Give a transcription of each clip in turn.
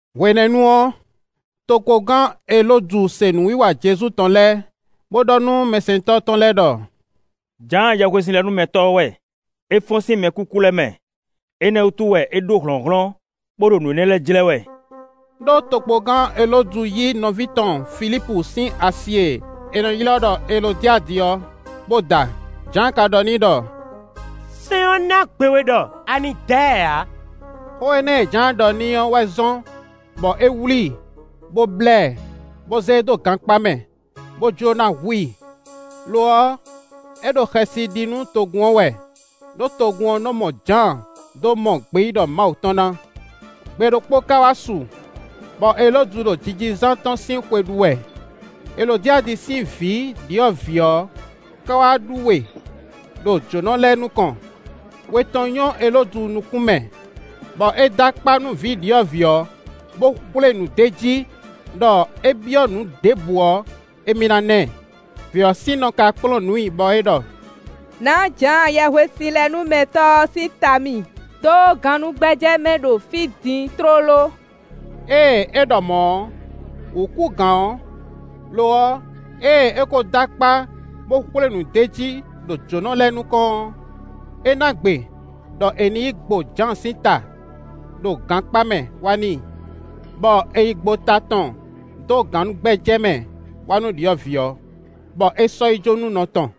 Hwenɛ́nu ɔ́, tokpɔngán Elódu se nǔwiwa Jezu tɔn lɛ́ɛ, bó ɖɔ nú mɛsɛntɔ́ tɔn lɛ́ɛ ɖɔ: “Jǎan Yɛhwesinlɛnúmɛtɔ́ ɔ́ wɛ; é fɔ́n sín mɛkúkú lɛ́ɛ mɛ; énɛ́ wútu wɛ é ɖó hlɔ̌nhlɔ́n, bó ɖo nǔ énɛ́ lɛ́ɛ jlɛ́ wɛ.” Ɖó tokpɔngán Elódu yí nɔví tɔn Filípu sín asi e è nɔ ylɔ́ ɖɔ Elodiadi ɔ́, bó da. Jǎan ka ɖɔ n'i ɖɔ: “Sɛ́n ɔ́ ná gbe we ɖɔ a nǐ da ɛ ǎ.” Xó énɛ́ e Jǎan ɖɔ n'i ɔ́ wɛ zɔ́n, bɔ é wlí i, bó blá ɛ, bó zé e dó gankpá mɛ, bó jló ná hu i; lo ɔ́, é ɖo xɛsi ɖi nú togun ɔ́ wɛ, ɖó togun ɔ́ nɔ́ mɔ Jǎan dó mɔ gbeyíɖɔ Mawu tɔn ná. Gbe ɖokpó ka wá su, bɔ Elódu ɖo jijizán tɔn sín xwe ɖu wɛ; Elodiadi sín vǐ ɖyɔ̌vǐ ɔ́ ka wá ɖú we ɖo jǒnɔ lɛ́ɛ nukɔn. We tɔn nyɔ́ Elódu nukún mɛ, bɔ é dó akpá nú vǐ ɖyɔ̌vǐ ɔ́, bo xwlé nǔ d'é jí ɖɔ é byɔ́ nǔ ɖěbǔ ɔ́, émí ná ná ɛ. Vǐ ɔ́ sín nɔ ka kplɔ́n nǔ i bɔ é ɖɔ: “Nǎ Jǎan Yɛhwesinlɛnúmɛtɔ́ ɔ́ sín ta mì dó gannúgbɛ́jɛ́ mɛ ɖo fí din tlóló.” Ée é ɖɔ mɔ̌ ɔ́, wǔ kú gǎn ɔ́; lo ɔ́, ée é kó dó akpá, bó xwlé nǔ d'é jí ɖo jǒnɔ lɛ́ɛ nukɔn ɔ́, é ná gbe ɖɔ è nǐ yi gbo Jǎan sín ta ɖo gankpá mɛ wá n'i. Bɔ è yi gbo ta tɔn dó gannúgbɛ́jɛ́ mɛ wá nú ɖyɔ̌vǐ ɔ́, bɔ é sɔ́ yi jó nú nɔ tɔn.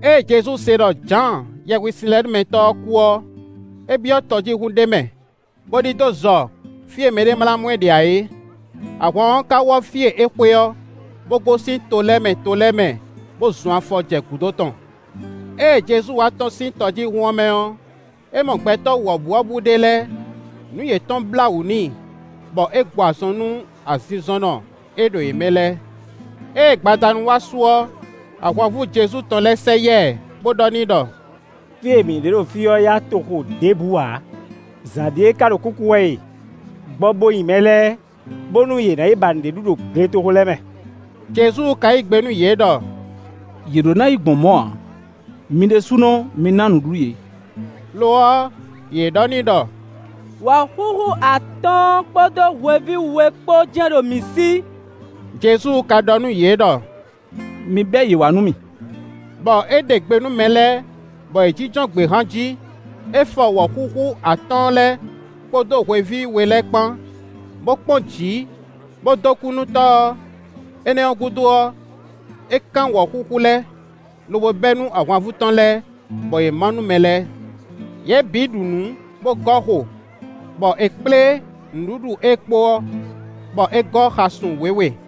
Ée Jezu se ɖɔ Jǎan Yɛhwesinlɛnúmɛtɔ́ ɔ́ kú ɔ́, é byɔ́ tɔjíhún ɖé mɛ, bó ɖidó zɔ fí e mɛɖé ma ná mɔ ɛ ɖe ǎ é. Ahwan ɔ́ ka wɔ́ fí e é xwe ɔ́, bó gosín to lɛ́ɛ mɛ to lɛ́ɛ mɛ, bó zɔn afɔ jɛ gǔdo tɔn. Ée Jezu wá tɔ́n sín tɔjíhún ɔ́ mɛ ɔ́, é mɔ gbɛtɔ́ wɔ̌buwɔ́bú ɖé lɛ́ɛ; nǔ yětɔn blá wǔ n'i, bɔ é gbɔ azɔn nú azinzɔnnɔ e ɖo yě mɛ lɛ́ɛ. Ée gbadanu wá su ɔ́, ahwanvú Jezu tɔn lɛ́ɛ sɛ yá ɛ, bó ɖɔ n'i ɖɔ: “Fí e mǐ ɖe ɖo fí ɔ́ yá dó toxo ɖěbǔ ǎ; zǎn ɖíe ká ɖo kúkú wɛ e; gbɔ bo nyi mɛ lɛ́ɛ, bónú yě ná yi ba nǔɖé ɖu ɖo gletoxo lɛ́ɛ mɛ.” Jezu ka yí gbe nú yě ɖɔ: “Yě ɖó ná yi gbɔn mɔ̌ ǎ; mi ɖésúnɔ mi ná nǔɖuɖu yě.” Lo ɔ́, yě ɖɔ n'i ɖɔ: “Wɔ̌xúxú atɔ́ɔ́n kpódó hweví we kpó jɛ́n ɖo mǐ sí.” Jezu ka ɖɔ nú yě ɖɔ: “Mi bɛ́ yě wá nú mì.” Bɔ é ɖe gbe nú mɛ lɛ́ɛ, bɔ yě jínjɔ́n gběhan jí. É fɔ wɔ̌xúxú atɔ́ɔ́n lɛ́ɛ, kpódó hweví we lɛ́ɛ kpán, bó kpɔ́n jǐ, bó dó kú nú Tɔ́ ɔ́. Énɛ́ ɔ́ gúdo ɔ́, é kán wɔ̌xúxú lɛ́ɛ, lobo bɛ́ nú ahwanvú tɔn lɛ́ɛ, bɔ yě má nú mɛ lɛ́ɛ. Yě bǐ ɖu nǔ, bó gɔ́ xo, bɔ è kplé nǔɖuɖu e kpo ɔ́, bɔ é gɔ́ xasun wěwe.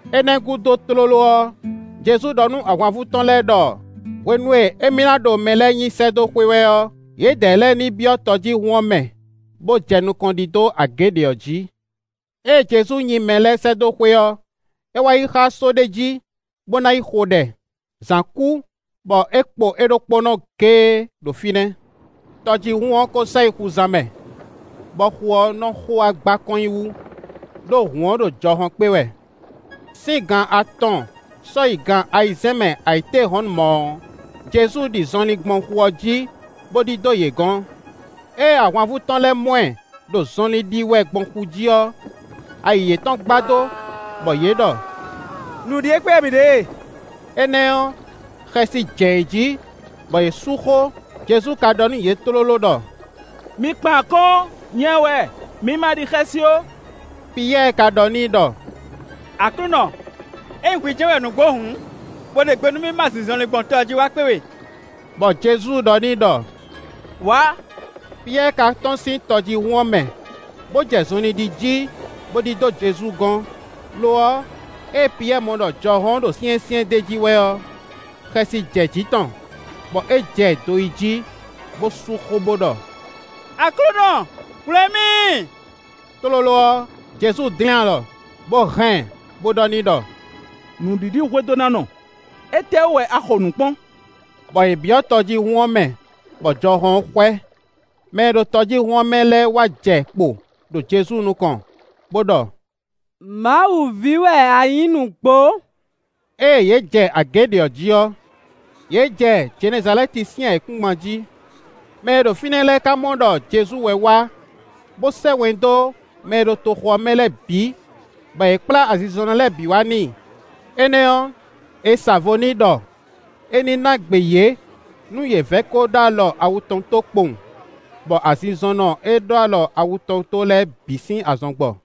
Énɛ́ gúdo tlóló ɔ́, Jezu ɖɔ nú ahwanvú tɔn lɛ́ɛ ɖɔ hwenu e émí ná ɖo mɛ lɛ́ɛ nyi sɛ́ dó xwé wɛ ɔ́, yědɛɛ lɛ́ɛ ní byɔ́ tɔjíhún ɔ́ mɛ, bó jɛ nukɔn ɖidó agě ɖě ɔ́ jǐ. Ée Jezu nyi mɛ lɛ́ɛ sɛ́ dó xwé ɔ́, é wá yi xá só ɖé jí, bó ná yi xo ɖɛ. Zǎn kú, bɔ é kpo é ɖokpónɔ géé ɖo fínɛ́. Tɔjíhún ɔ́ ko sɛ yi xuzan mɛ, bɔ xu ɔ́ nɔ xo wá gba kɔn nyi wú, ɖó hǔn ɔ́ ɖo jɔhɔn kpé wɛ. Sín gan atɔn sɔ́ yi gan ayizɛ́n mɛ ayǐtéhɔ̌nnu mɔ̌ ɔ́, Jezu ɖi zɔnlin gbɔn xu ɔ́ jí, bó ɖidó yě gɔ̌n. Ée ahwanvú tɔn lɛ́ɛ mɔ ɛ ɖo zɔnlin ɖi wɛ gbɔn xu jí ɔ́, ayi yětɔn gbadó, bɔ yě ɖɔ: “Nǔ ɖíe kpé wɛ mǐ ɖe e!” Énɛ́ ɔ́, xɛsi jɛ yě jí, bɔ yě sú xó. Jezu ka ɖɔ nú yě tlóló ɖɔ: “Mi kpan akɔ́n, nyɛ wɛ; mi ma ɖi xɛsi ó.” Piyɛ́ɛ ka ɖɔ n'i ɖɔ: “Aklúnɔ, ényí hwi jɛ́n wɛ nǔgbó hǔn, bo ɖe gbe nú ma ɖi zɔnlin gbɔn tɔ ɔ́ jí wá kpé we.” Bɔ Jezu ɖɔ n'i ɖɔ: “Wǎ!” Piyɛ́ɛ ka tɔ́n sín tɔjíhún ɔ́ mɛ, bó jɛ zɔnlin ɖi jí, bó ɖidó Jezu gɔ́n. Lo ɔ́, ée Piyɛ́ɛ mɔ ɖɔ jɔhɔn ɔ́ ɖo syɛ́nsyɛ́n d'é jí wɛ ɔ́, xɛsi jɛ jǐ tɔn, bɔ é jɛ do yi jí, bó sú xó bó ɖɔ: “Aklúnɔ, hwlɛ̌n mì!” Tlóló ɔ́, Jezu dlɛ́n alɔ, bó hɛn ɛ, bó ɖɔ n'i ɖɔ: “Nǔɖiɖihwedónánɔ, étɛ́wú wɛ a xo nǔ kpɔ́n?” Bɔ yě byɔ́ tɔjíhún ɔ́ mɛ, bɔ jɔhɔn ɔ́ xwɛ. Mɛ e ɖo tɔjíhún ɔ́ mɛ lɛ́ɛ wá jɛ kpo ɖo Jezu nukɔn, bó ɖɔ: “Mawu ví wɛ a nyǐ nǔgbó.” Ée yě jɛ agě ɖě ɔ́ jí ɔ́, yě jɛ Jenɛzalɛ́ti sín ayǐkúngban jí. Mɛ e ɖo fínɛ́ lɛ́ɛ ka mɔ ɖɔ Jezu wɛ wá, bó sɛ́ wɛn dó mɛ e ɖo toxo ɔ́ mɛ lɛ́ɛ bǐ, bɔ yě kplá azinzɔnnɔ lɛ́ɛ bǐ wá n'i; énɛ́ ɔ́, è sa vo n'i ɖɔ é ní ná gbe yě nú yě vɛ́ kó ɖó alɔ awu tɔn tó kpowun; bɔ azinzɔnnɔ e ɖó alɔ awu tɔn tó lɛ́ɛ bǐ sín azɔn gbɔ.